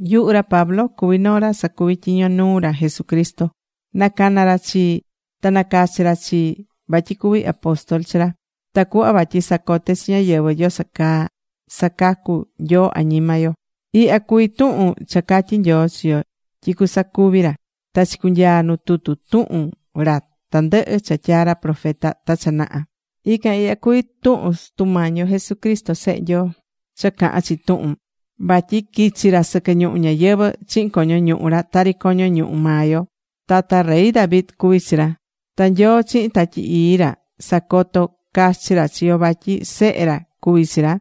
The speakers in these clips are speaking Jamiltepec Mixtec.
Yuhu ra Pablo cuví noo ra sacuví tyiño nuu ra Jesucristo. Nacana̱ ra chii, ta nacachi̱ ra chii vatyi cuví apóstol chi ra, tacuhva vatyi sacote chi ñáyɨvɨ yoso caa sacacu̱ Nyoo añima yo. Ihya cuví tuhun cha catyi̱ Nyoo chi yo tyi cusacuvi ra, ta chicunyaa̱ nu tutu tuhun ra tandɨhɨ cha tyaa̱ ra profeta ta cha naha. Ican ihya cuví tuhun Sutu Mañi yo Jesucristo Sehe Nyoo cha cahán chi tuhun, vatyi quichi̱ ra sɨquɨ ñuhu ñayɨvɨ̱ chihin coño ñuhu ra tari coño ñuhu maa yo. Tata rey David cuvi̱ chi ra. Ta Nyoo chihin Tatyi Ii ra sacoto̱ cachi ra chi yo vatyi Sehe ra cuví chi ra,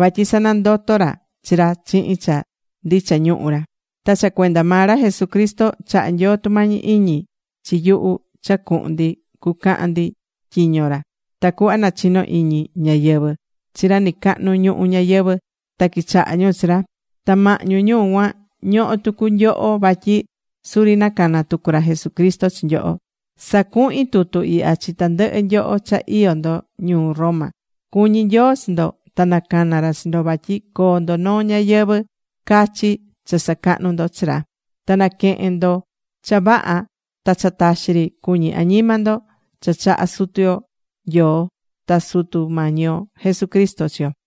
vatyi sanandoto̱ ra chi ra chihin cha ndicha ñuhu ra. Ta cha cuenda maa ra Jesucristo chaha̱ Nyoo tumañi iñi chi nyuhu cha cuhun ndi cucaca ndi tyiño ra, tacuhva nachino iñi ñáyɨvɨ chi ra nɨcahnu ñuhu ñayɨvɨ̱, ta quichaha ñu chi ra. Ta mahñu ñu cuan, ñohó tucu nyoho vatyi suri nacana̱ tucu ra Jesucristo chi nyoho. Sacuhín tutu ihya chi tandɨhɨ nyoho cha iyó ndo ñuu Roma. Cuñí Nyoo chi ndo ta nacana̱ ra chi ndo vatyi coo ndo noo ñayɨvɨ̱ cachi cha sacahnu ndo chi ra. Na naquehen ndo cha vaha ta cha taxi ri cuñí añima ndo cha chahá Sutu yo Nyoo ta Sutu Mañi yo Jesucristo chi yo.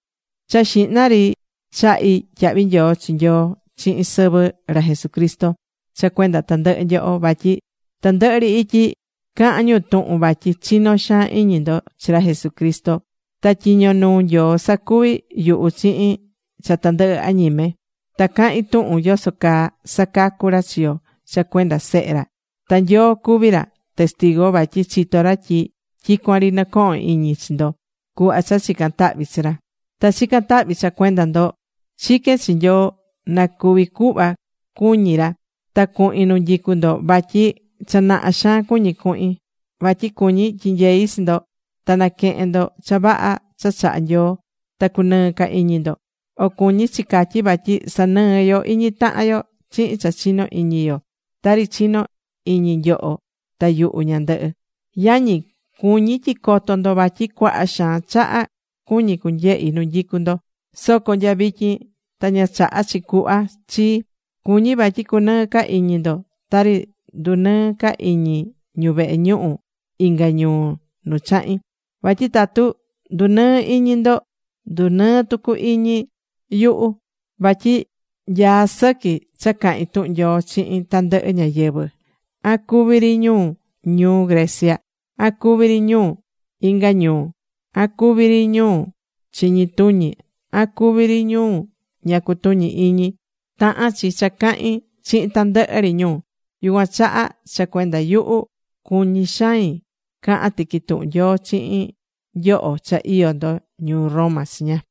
Cha xihna ri chahí tyahvi nyoo chi Nyoi chihin sɨvɨ ra Jesucristo, cha cuenda tandɨhɨ nyoho. Vatyi tandɨhɨ ri ityi cahán ñu tuhun vatyi chinó xaan iñi ndo chi ra Jesucristo. Ta tyiño nuu Nyoo sacuví yuhu chihin cha tandɨhɨ añime. Ta cahín tuhun yoso caa sacacu̱ ra chi yo cha cuenda Sehe ra. Ta Nyoo cuví ra testigu vatyi chitó ra tyi tyicuan ri nɨcohón iñi chi ndo cuhva cha chicán tahvi chi ra. Ta chicán tahvi cha cuenda ndo. Chiquén chi Nyoo na cuvi cuhva cuñí ra, ta cuhin nu nyicú ndo, vatyi cha naha xaan cuñí cuhin. Vatyi cuñí tyinyei chi ndo, ta naquehen ndo cha vaha cha chahá Nyoo ta cunɨɨ ca iñi ndo. O cuñí chi catyí vatyi sanɨɨ yo iñi tahan yo chihin cha chinó iñi yo, tari chinó iñi nyoho ta yuhu ñandɨhɨ. Yañi, cuñí tyi coto ndo vatyi cuaha xaan chaha cuñí cunyehi nu nyicú ndo, soco nya vityin ta ña chaha̱ chi cuhva chii. Cuñí vatyi cunɨɨ ca iñi ndo tari ndunɨɨ̱ ca iñi ñu vehe ñuhu inga ñuu nu chahi̱n. Vatyi tatu ndunɨɨ́ iñi ndo, ndunɨɨ́ tucu iñi yuhu. Vatyi nyaá sɨqui cha cahin tuhun Nyoo chihin tandɨhɨ ñáyɨvɨ, an cuví ri ñu ñuu Grecia, an cuví ri ñu inga ñuu, an cuví ri ñu chiñi tuñi, an cuví ri ñu ña cutuñí iñi. Tahán chi cha cahin chihin tandɨhɨ ri ñu. Yucuan chaha, cha cuenda yuhu, cuñí xain cahan tiqui tuhun Nyoo chihin nyoho cha iyó ndo ñuu Roma chiña.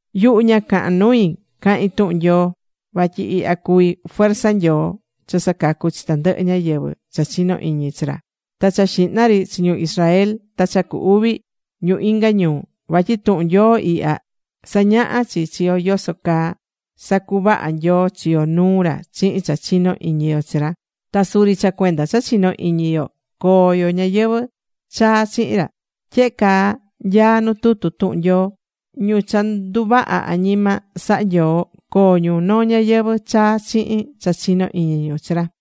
Yuhu ña cahán nui cahín tuhun Nyoo, vatyi ihya cuví fuerza Nyoo cha sacacú chi tandɨhɨ ñáyɨvɨ cha chinó iñi chi ra. Ta cha xihna ri chi ñu Israel. Ta cha cu uvi, ñu inga ñuu. Vatyi tuhun Nyoo ihya, sañahá chi chi yo yoso caa sacuvahá Nyoo chi yo nuu ra chihin cha chinó iñi yo chi ra. Ta suri cha cuenda cha chinó iñi yo, coo yo ñayɨvɨ̱ chaa chihin ra. Tyehe caa nyaá nu tutu tuhun Nyoo: “Ñu cha nduvaha̱ añima saha̱ Nyoo, coo ñu noo ñayɨvɨ̱ chaa chihin cha chinó iñi ñu chi ra.”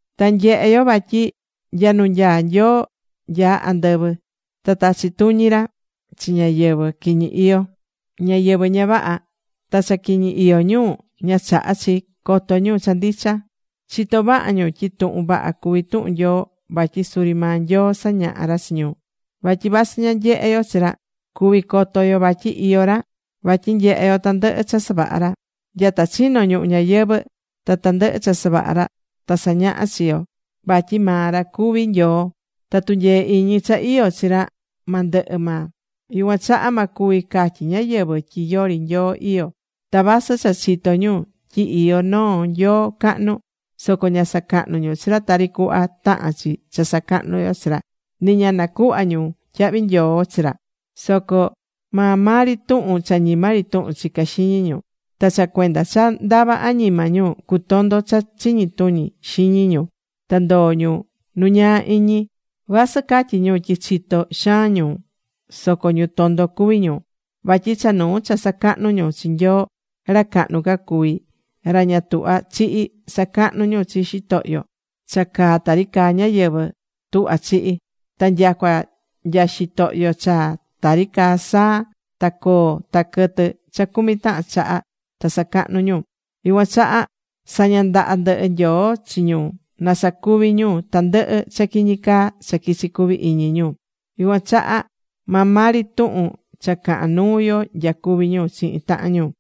Ta nyehé yo vatyi nya nu nyaá Nyoo nya andɨvɨ ta tachí tuñi ra chi ñáyɨvɨ quiñi iyó, ñáyɨvɨ ña vaha. Ta cha quiñi iyó ñu, ña chahá chi coto ñu cha ndicha. Chitó vaha ñu tyi tuhun vaha cuví tuhun Nyoo vatyi suri maa Nyoo sañahá ra chi ñu. Vatyi vasɨ ña nyehé yo chi ra, cuví coto yo vatyi iyó ra vatyi nyehé yo tandɨhɨ cha savaha̱ ra. Nyata chino̱ ñuhu ñayɨvɨ̱ ta tandɨhɨ cha savaha̱ ra ta sañahá chi chi yo vatyi maa ra cuví Nyoo, ta tunyee iñi cha iyó chi ra ma ndɨhɨ maa. Yucuan chaha ma cuvi catyi ñáyɨvɨ tyi yori Nyoo iyó. Ta vasɨ cha chitó ñu tyi iyó noo Nyoo cahnu, soco ña sacahnú ñu chi ra tari cuhva tahán chi cha sacahnu yo chi ra. Nɨ ña nacuhva̱ ñu tyahvi nyoo chi ra. Soco maa maa ri tuhun cha ñima ri tuhun chicá xiñi ñu. Ta cha cuenda cha ndava añima ñu, cutondo̱ cha chiñi tuñi xiñi ñu ta ndoo̱ ñu nu ñaa iñi. Vasɨ catyí ñu tyi chitó xaan ñu soco ñu tondo cuví ñu. Vatyi cha nuu cha sacahnú ñu chi Nyoo ra cahnu ca cuví, ra ña tuhva chihi; sacahnú ñu chi xitohyo cha caá tari caá ñáyɨvɨ tuhva chihi. Ta nyacua nya xitohyo cha tari caá saa, ta coo, ta quɨtɨ cha cumi tahan chaha, ta sacahnú ñu. Yucuan chaha saña̱ ndaha ndɨhɨ Nyoo chi ñu na sacuvi ñu tandɨhɨ cha quiñi caa cha quichí cuvi iñi ñu. Yucuan chaha maa maa ri tuhun cha cahán nuu yo nyacuví ñu chihin tahan ñu.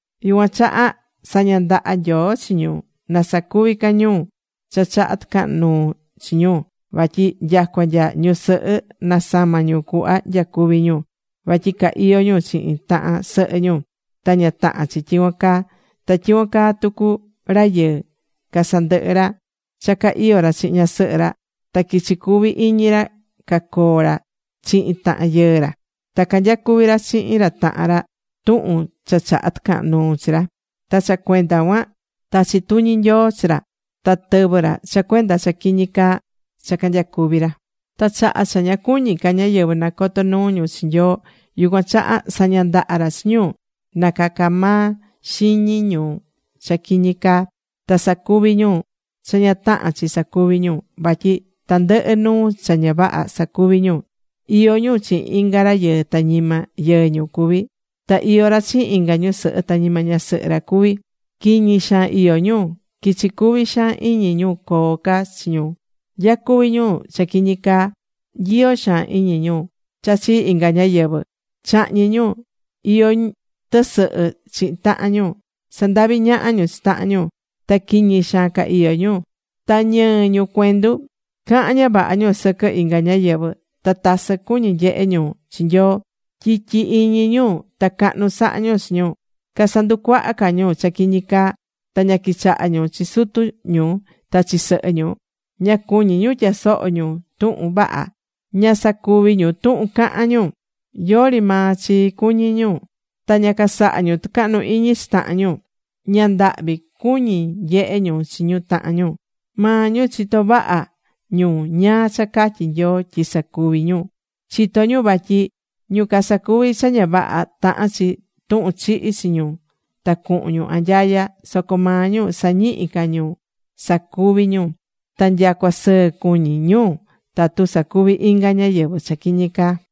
Yucuan chaha saña̱ ndaha Nyoo chi ñu na sacuvi ca ñu cha chahá tɨcahan nuu chi ñu. Vatyi nyacua nya ñusɨhɨ nasama̱ ñu cuhva nyacuví ñu, vatyi ca iyó ñu chihin tahan sɨhɨ ñu, ta ña tahán chi tyicuan caa. Ta tyicuan caa tucu rayɨɨ, casandɨhɨ̱ ra cha ca iyó ra chihin ñasɨhɨ ra, ta quichí cuvi iñi ra cacoo ra chihin tahan yɨɨ ra. Ta canyacuví ra chihin ra tahan ra, tuhun cha chahá tɨcahan nuu chi ra. Ta cha cuenda cuan tachí tuñi Nyoo chi ra ta tɨvɨ́ ra cha cuenda cha quiñi caa cha canyacuví ra. Ta chaha cha ña cuñí ca ñáyɨvɨ nacoto nuu ñu chi Nyoo, yucuan chaha saña̱ ndaha ra chi ñu na caca maa xiñi ñu cha quiñi caa, ta sacuvi ñu cha ña tahán chi sacuvi ñu. Vatyi tandɨhɨ nuu cha ña vaha sacuví ñu. Iyó ñu chihin inga rayɨɨ ta ñima yɨɨ ñu cuví. Ta iyó ra chihin inga ñusɨhɨ ta ñima ñasɨhɨ ra cuví. Quiñi xaan iyó ñu. Quichi cuvi xaan iñi ñu coo ca chi ñu. Nyacuví ñu cha quiñi caa. Nyiyó xaan iñi ñu cha chi inga ñáyɨvɨ. Chahñí ñu. Iyó ñu tɨsɨhɨ chihin tahan ñu. Sandaví ñaha ñu chi tahan ñu. Ta quiñi xaan ca iyó ñu. Ta ñɨɨ ñu cuendu. Cahán ña vaha ñu sɨquɨ inga ñáyɨvɨ. Ta tasɨ cuñí ñu nyehe ñu chi Nyoo. Tyityi iñi ñu. Ta cahnu sahá ñu chi ñu. Casanducuahá ca ñu cha quiñi caa. Ta ña quichahá ñu chi sutu ñu, ta chi sɨhɨ ñu. Ña cuñí ñu tyasoho ñu tuhun vaha. Ña sacuví ñu tuhun cahán ñu. Yori maa chi cuñí ñu. Ta ña casahá ñu tɨcahnu iñi chi tahan ñu. Ña ndahvi cuñí ñu nyehe ñu chi tahan ñu. Maa ñu chitó vaha ñu ñáá cha catyí Nyoo tyi sacuví ñu, chitó ñu vatyi ñu casacuví cha ña vaha, tahán chi tuhun chihi chi ñu ta cuhun ñu anyaya. Soco maa ñu sañihí ca ñu sacuví ñu. Ta nyacua sɨɨ cuñí ñu tatu sacuví inga ñáyɨvɨ cha quiñi caa.